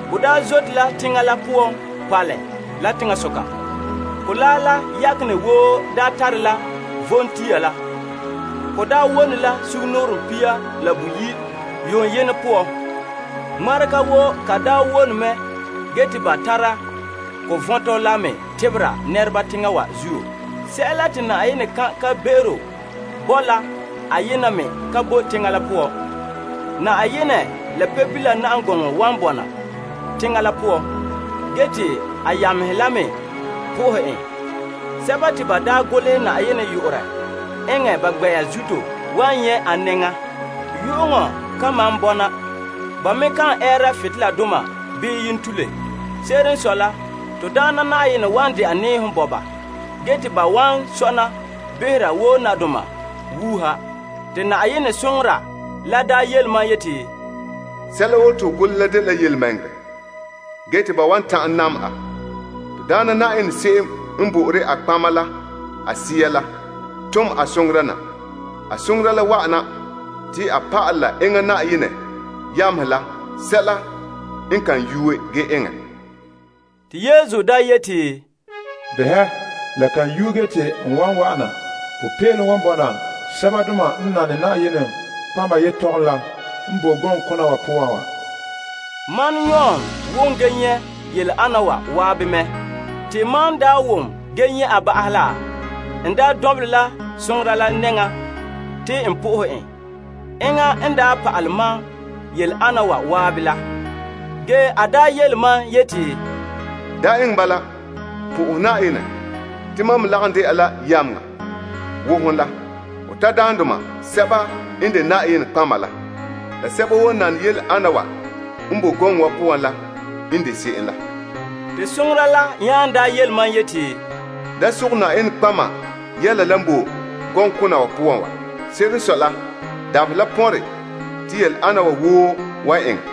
Bo zote la teŋa la poan paalɛ la teŋasoka. Kolaa la yakenɛ woo tare la vom tia la. Ko wone la sugumnɔɔren pia la boyi' yuunɛ, ŋmarega woo ka daa wone mɛ ge te ba tara ko vɔntɔ la me tebera teŋhe la. Sɛla te Yenɛ kan' kan'be'ero bo la ayena me ka bo teŋa la poan. Yenɛ la Pebila na'am gɔŋɔ wan bɔna teŋa la poan, ge te a yamehe la me na'aha en. Sɛba te ba golehɛ Yenɛ yu'urɛ eŋɛ a gbɛ'ɛra zuto wan nyɛ' a nɛŋan. Yu'uŋɔ kan malom bɔna. Ba me kan ɛɛra butoleladoma bii yentule. Se'ere n sɔe la, Na'ayenɛ n de Yenɛ wan dɛna nɛɛhom bo ba, ge te ban wan sɔna behera wo nadoma wuuha. Te Yenɛ soŋora la daa yele mam yeti, Sɛla woo te ho golehɛ la dela yelemɛŋɛrɛ ge te ban wan ta'an dɛla a. Na'ayenɛ to Yenɛ se'em n bo'ore a nɔtɔgɔheba la ba sɛɛhe la n tom a soŋora na. Te a pa'alɛ a yamehe la sɛla n ka yuuɛ ge eŋɛ. Te Yesu yeti, Behɛ, la kan yuuɛ ge te n wa'an na. Popeelom wan bɔna sɛbadoma n nane Yenɛ nɔtɔgɔha yetɔgom la n boe gɔŋkona wa poan wa. Mam Yon wom gee nyɛ' yele ana wa waabe mɛ. Te mam wom ge nyɛ' a ba'ahɛ la, n lu soŋora la nɛŋan te n na'ahe en. Enŋa n pa'alɛ mam yele ana wa la. Ge a yele mam yeti, Da eŋɛ bala. Na'aha Yenɛ. Te mam me lagom de'a la yameŋa wo hon la ho tadaandoma, sɛba n de nɔtɔgɔheba la, la sɛba woo n nane yele ana wa n bo gɔŋɔ wa poan la n de se'em la. Te soŋora la nya yele mam yeti, Da sogɛ nɔtɔgɔheba yɛla la n bo gɔŋkona wa poan wa. Se'ere n sɔe la, dabaherɛ la pɔnre te yele ana wa woo wan eŋɛ.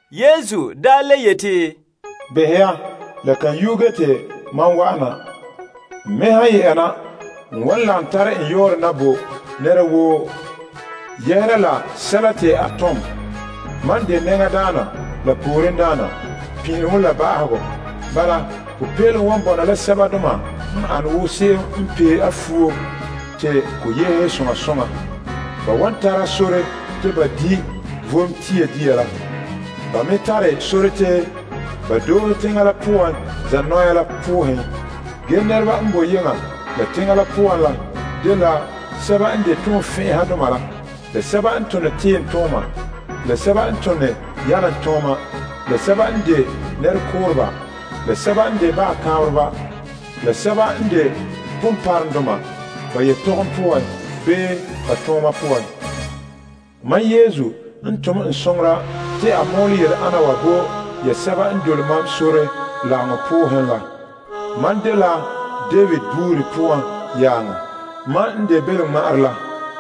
Yesu le yeti, Behɛ ya, n kan go'om n ken na. N wan tare n yɔɔrɛ na bo nɛra woo yɛhera la sɛla te a tom. Mam n de nɛŋadaana la poorendaana, pin'ileŋɔ la ba'ahegɔ. Bala, popeelom wan bɔna la sɛbadoma n pee a futo te to ana fa'a. Ban wan tara sore te ba di' vom tia dia la. Ba me tare sore te ba doohe teŋa la poan zanɔya la poohen. Ge nɛreba n boe yeŋa la teŋa la poan la dela sɛba n de toonfɛn'ɛhadoma la, la sɛba n tone tiimtooma, la sɛba n tone yalomtooma, la sɛba n de nɛrekooreba, la sɛba n de baga kaanbereba, la sɛba n de ponpɔrɔŋdoma ba yetɔgom poan bii ba tooma poan. Mam Yesu n tom n soŋora te a mɔɔlɛ yele ana wa bo ya sɛba n dole mam sore lagaŋɔ poohen la. Mam dela David yaaŋa. Mam n de belomŋma'arɛ la.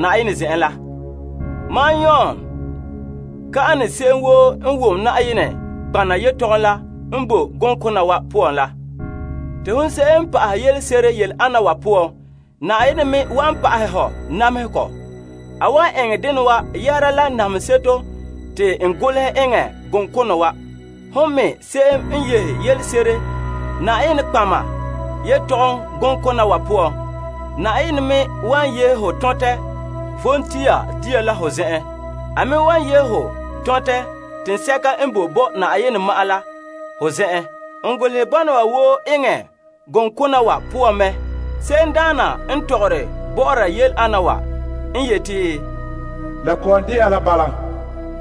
Mam Yon yeti ya mɛ la ninmɔ'ɔrɛ yeti se'em woo n wom Yenɛ nɔtɔgɔha yelehom la n boe gɔŋkona wa poan la. Te hon se'em n pa'ahɛ yelese'ere yele ana wa poan, Yenɛ me wan pa'ahɛ ho namehegɔ. A wan eŋɛ dena wa yɛhera la namehe seto te n golehɛ eŋɛ gɔŋkona wa. Hon me se'em n yehe yelese'ere nɔtɔgɔheba yelehom gɔŋkona wa poan, Yenɛ me wan yehe ho tɔntɛ vom tia dia la ho zen'en. A me wan yehe ho tɔntɛ toolom teŋa. N golehɛ ana wa woo eŋɛ gɔŋkona wa poan mɛ. Se'emdaana n tɔgɔre yele ana wa n yeti, La kɔ'ɔn de'a la bala.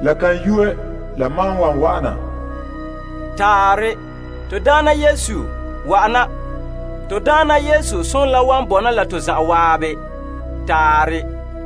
La kan yuuɛ la mam wan wa'an. Taarɛ. To Daana Yesu, wa'ana. To Daana Yesu zo'ohogɔ la wan bɔna la to zan'an.